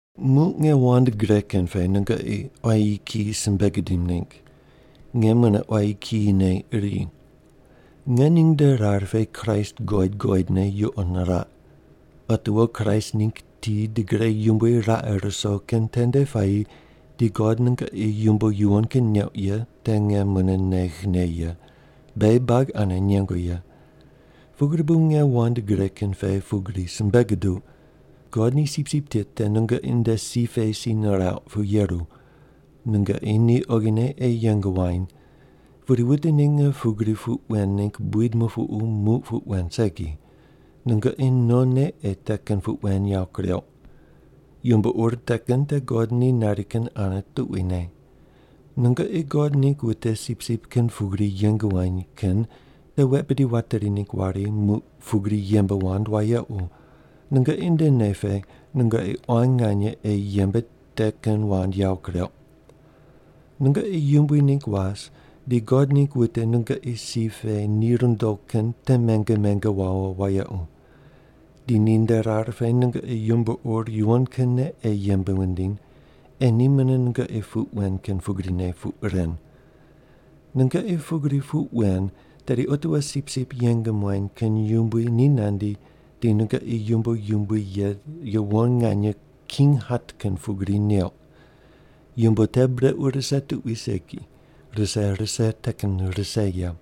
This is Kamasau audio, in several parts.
Muq nge wand gre kin pe nungoqi quayi kiyi simbe gidim ningg. Nge mune quayi kiyine iri. Nge ning nde rar pe Kraist guqoid guqoidne yuqo niraq. Otiwo Kraist ningg ti di gre yumbui raqe ruso kin tende puayi di God nungoqi yumbo yuwon kin neuq ye te nge mune neghne ye, beghi buagi ane nengu ye. Pugri bu nge wand gre kin pe pugri simbe guduq, God ni sipsip tit te nungoqi nde si pe si nirauq pu yeru. Nungoqi ni oghine ei yeng wuany. Pudi wute ninge pugri puq wen ningg buid mupuqu muq puq wen segi, nungoqi nonne ei te kin puq wen yawo kureuq. Yumbo ur te kin te God ni nari kin ane tuquine. Nungoqi God ningg wute sipsip kin pugri yeng wuany kin te wet bidi wateri ningg wari muq pugri yembe wand wayequ, nungoqi nde nei pe nungoqi quan nganye ei yembe te kin wand yawo kureuq. Nungoqi yumbui ningg was di God ningg wute nungoqi si pe ni rundo kin te menge menge wawo wayequ. Di ninde rar pe nungoqi yumbo ur yuwon kinne ei yembe wundiny, ei ni mune nungoqi puq wen kin pugrine puq ren. Nungoqi pugri puq wen, tedi otiwo sipsip yeng muany kin yumbui ni nandi di nungoqi yumbo yumbui ye yuwon nganye king hat kin pugri neuq. Yumbo te brequ rise tuqui segi, rise rise te kin rise ye.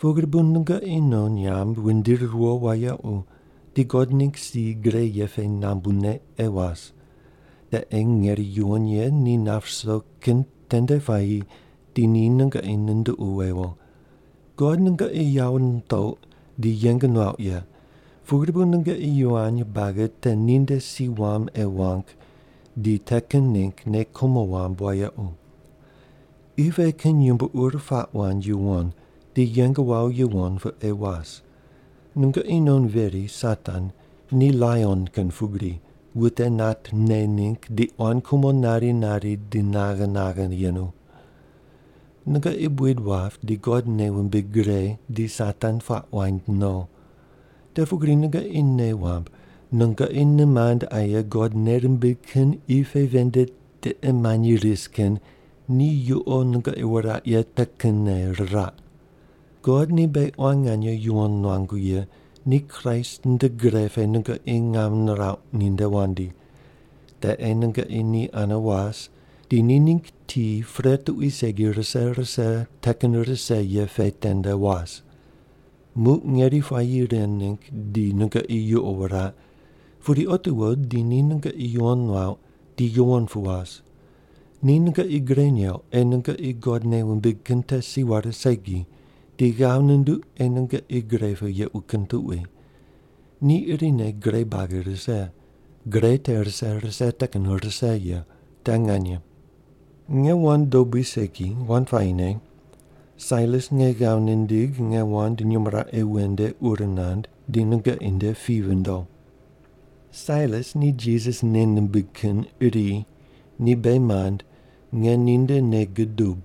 Pugri bu nungoqi non nyamb wundiri riwo wayequ di God ningg si gre ye pe nambune ei was. Te ei ngeri yuwon ye ni nap ruso kin tende puayi di ni nungoqi nunduqu wewo. God nungoqi yawo nitouq di yeng nuauq ye, pugri bu nungoqi yivany buagi te ninde si wam ei wang di te kin ningg nei kumo wamb wayequ. Qi pe kin yumbo ur puaq wand yuwon di yeng wawo yuwon pu ei was. Nungoqi non veri Satan ni laion kin pugri wute nat ne ningg di quan kumo nari nari di naghe naghe yenu. Nungoqi buid wap di God nei wumbig gre di Satan puaq waind no. Te pugri nungoqi nei wamb, nungoqi nimand aye God nei rimbig kin qi pe ven nde tiqe manyi ris kin ni yuqo nungoqi wuraq ye te kinne riraq. God ni beghi quan nganye yuwon nuangu ye ni Kraist nde gre pe nungoqi ngam nirauq ninde wandi. Te ei nungoqi ni ane was, di ni ningg ti pre tuqui segi rise rise te kin rise ye pe tende was. Muq ngeri puayi ren ningg di nungoqi yuqo wuraq, pudi otiwo di ni nungoqi yuwon nuauq di yuwon pu was. Ni nungoqi gre neuq ei nungoqi God nei wumbig kin te si ware segi, di ghav nunduq ei nungoqi gre pu yequ kin tuqui. Ni irine gre buagi rise. Gre te rise rise te kin rise ye. Te nganye. Nge wand dobui segi, wand puayine. Sailas nge ghav nindigh nge wand nyumo raqe wen nde ur nand, di nungoqi nde pi vindo. Sailas ni Jisas nei nimbig kin iri, ni beghi mand, nge ninde nei gudub.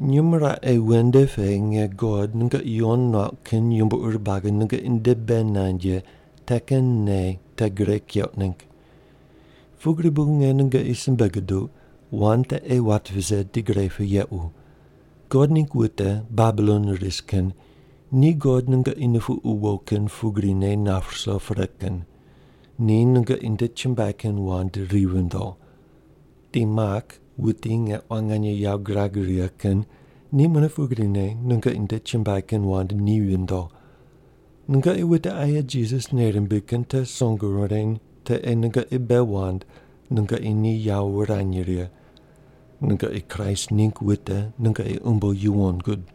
Nyumo raqe wen nde pe nge God nungoqi yuwon nuauq kin yumbo ur buagi nungoqi nde bei nand ye te kin nei te gre keuq ningg. Pugri bu nge nungoqi simbe guduq, wand te ei wat vise di gre pu yequ. God ningg wute Babilon ris kin ni God nungoqi nupuqu wo kin pugrine nap ruso pre kin. Ni nungoqi nde chumbuai kin wand ri vindo. Di Mak, wuti nge quan nganye yawo girag righe kin, ni mune pugrine nungoqi nde chumbuai kin wand ni vindo. Nungoqi wute aye Jisas nei rimbig kin te song wureny te ei nungoqi bei wand nungoqi ni yawo wurany righe. Nungoqi Kraist ningg wute nungoqi umbo yuwon gud.